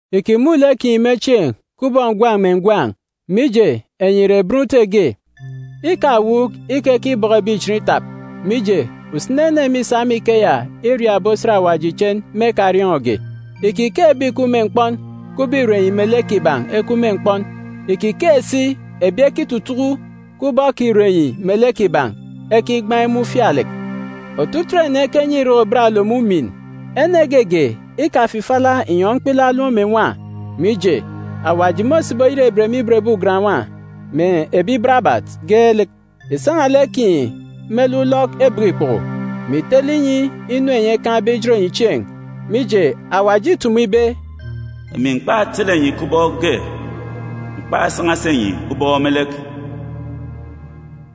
Ìkimun̄ lek kinyi me chieen̄ kubọk ngwan̄ mè ngwan̄, mije, enyi ìre bọn Ute ge. Ikawuuk ikekibọkọ ebi ichen itap, mije, usini ene mîsa me ikeya iriak ebi osat Awaji ichen me ekariọọn̄ge. Ìkikeek ebi ìkup me mkpọn kubọk ìre enyi melek kiban̄ ekup me mkpọn. Ìkikeek si ebi ekitutuku kubọk ìre enyi melek kiban̄ ekigbaan̄ imun̄ ufialek. Otutuuk ene ekenyi irek ibat-olom umin. Ene geege ikafifila inyọn̄ mkpilaak olom mè nwa, mije, Awaji môsibi oyerebet me ibot ebi ugan-nwa, mè ebi barabat geelek. Ìsan̄a lek kinyi me lek ulọk ebek ikpoko, mè ìtele inyi inu enyi ekaan̄be ijot enyi chieen̄. Mije Awaji îtumu ibe, “Emi m̀kpasan̄a enyi chieen̄ me lek,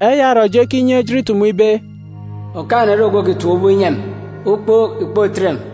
Eya orọ eji ekinye ejit itumu ibe, “Ogwukaan̄-ene ore ogwu òkitap ubọk inyi emi, ukpook ìkpotet emi!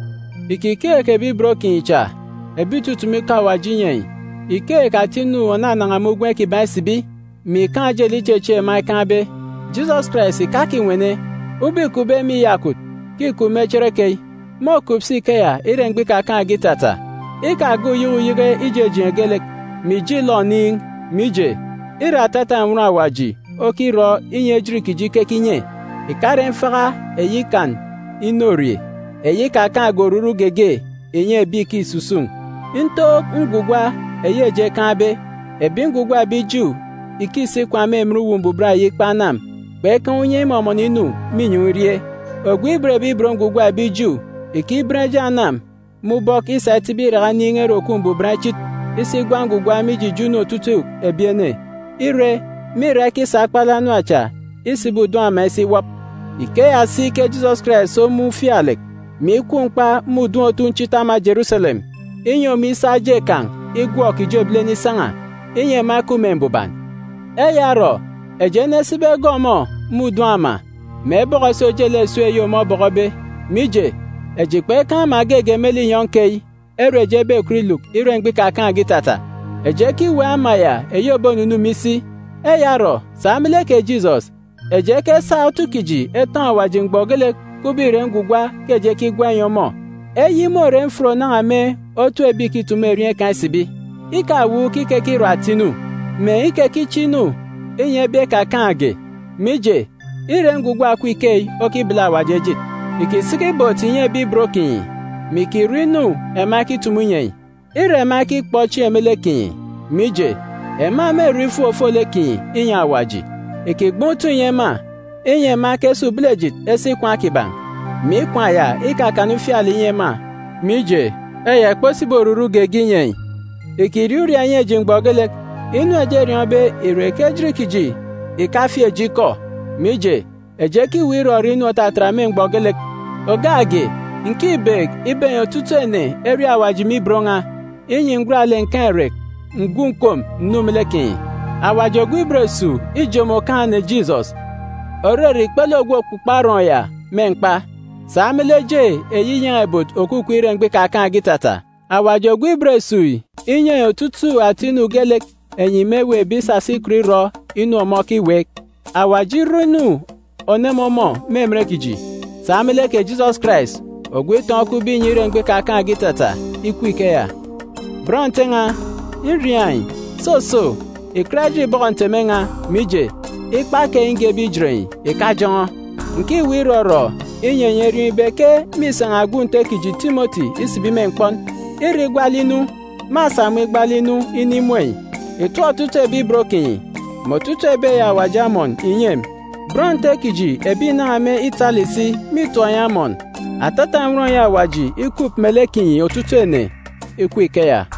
Ìkikeek ebi ibot kinyi cha, ebi ìtutumu ikọ Awaji inyi enyi. Ìkeek ata inu ònanan̄a me ugwem kiban̄ isibi, mè ìkaan̄ ojelek ichechieek ema ekaan̄be. Jisọs Karais ìkakinwene, ubọk îkupbe me iyakwut ke îkup me cherekeyi, môkup si ikeya ire mgbọ ikakaan̄ge itata. Ikagọọk uyeke uyeke ijejeen̄ geelek, mè ìje ìlọ oniin̄. Mije, îre atata nnwọn Awaji okirọ inyi ejit kiji ikeke inye, ìkare mfaka eyi ikan inorie, eyi ikakaan̄ge oruru geege ìnyi ebi ìkisusun̄. Ntook ngwugwa eyi eji ekaan̄be, ebi ngwugwa ebi Ju ìkisi ikwaan̄ me emen Atanga Chinichini kpekaan̄ unye imọmọnọ inu me inyọn̄ irie. Ogwu òban Awaji ebi Ju ìkiben eje anam me ubọk isa itibi iraka inin̄ Ere Òkup Mbuban Ichit isi igwa ngwugwa mije ijo inu otutuuk ebi ene, ire, mîra ikisa akpalek anam cha isibi udun̄ ere m̀gba-ǹgwele ukan̄ ya ema elukbe isi iwọp. Ikeya si ke Jisọs Karais omun̄ ufialek, mè ikwu mkpa me udun̄ otunchit ama Jeruselem, inyi ọmọ isa eje kan̄ igwọk ijo ebilene isan̄a, inyi ema ekup me mbuban. Eya orọ, eji enesibi egọọk ọmọ me udun̄ ere m̀gba-ǹgwele ukan̄ ya, mè ebọkọ si ojelek esip eyi ọmọ obọkọbe. Mije, eji kpekaan̄ ama geege me linyọn̄ keyi ere eji ebekọt iluk ire mgbọ ikakaan̄ge itata. Eji ekiweek ama ya eyi òbonunu me isi. Eya orọ, sa me lek kè Jisọs, eji ekesa otu kiji etọn̄ Awaji mgbọ geelek, kubọk ìre ngwugwa ke eji ekigwa inyi ọmọ. Eyi môre mfut ònan̄a me otu ebi ìkitumu erieen̄ kan̄ isibi. Ikawuuk ikekirọ ata inu, mè ikekiche inu inyi ebi ekakaan̄ge. Mije, îre ngwugwa òkup ikeyi okibele Awaji ejit. Ìkisiki ibot ìnyi ebi ibot kinyi, mè ìkirọ inu ema ekitumu inyi enyi. Îre ema ekikpọ chieen̄ me lek kinyi, mije, ema mêrọ ifuk ofolek kinyi inyi Awaji. Ìkigban̄ utọn̄ ìnyi ema, inyi ema ekesa ubelejit esi ikwaan̄ kiban̄, mè ikwaan̄ ya ikakana ufialek ìnyi ema. Mije, eya ìkposibi oruru geege inyi enyi. Ìkiriaak uriaak ìnyi eji mgbọ geelek. Inu eji eriọọn̄be ìre ke ejit kiji ìkafieek eji ikọ, mije, eji ekiweek irọrọ inu òtatat me mgbọ geelek. Ògak ge, ǹkibeek ibe enyi otutuuk ene eriaak Awaji me ibot n̄a, inyi ǹgwat lek ǹkaan̄ irek ǹgwu ǹkom ǹnu me lek kinyi. Awaji, ogwu ibot esuuk, îjomo Okaan̄-ene Jisọs, òrere ikpele Ogwu Òkpukpo Arọọn̄ ya, me mkpa, sa me lek eje eyi inyan̄a-ibot òkukup ire mgbọ ikakaan̄ge itata. Kè Awaji, ogwu ibot esuuk yi, inyi enyi otutuuk ata inu geelek enyi mêweekbe isasa ikọt irọ inu ọmọ okiweek. Kè Awaji irọ inu òneme ọmọ me emen kiji, sa me lek kè Jisọs Karais, ogwu itọn̄ okupbe inyi ire mgbọ ikakaan̄ge itata. Ikup ikeya! Bọn Nte n̄a, nriaak enyi, soso, ìkat ejit ìbọkọ nteme n̄a, mije, ikpa keyi ngebe ijet enyi ìkajọn̄ọ. Ǹkiweek irọrọ inyi enyi eriọọn̄ ibe ke mîsan̄a gwun̄ Nte kiji Timọti isibi me mkpọn. Ire igwat lek inu, mâsa ọmọ igbaalek inu inimun̄ enyi. Ìtọp otutuuk ebi ibot kinyi, mè otutuuk ebi eyi Awaji amọn ìnyi emi. Bọn Nte kiji ebi ìnan̄a me Itali si mîtọp enyi amọn. Atata nnwọn eyi Awaji ikup melek kinyi otutuuk ene! Ikup ikeya!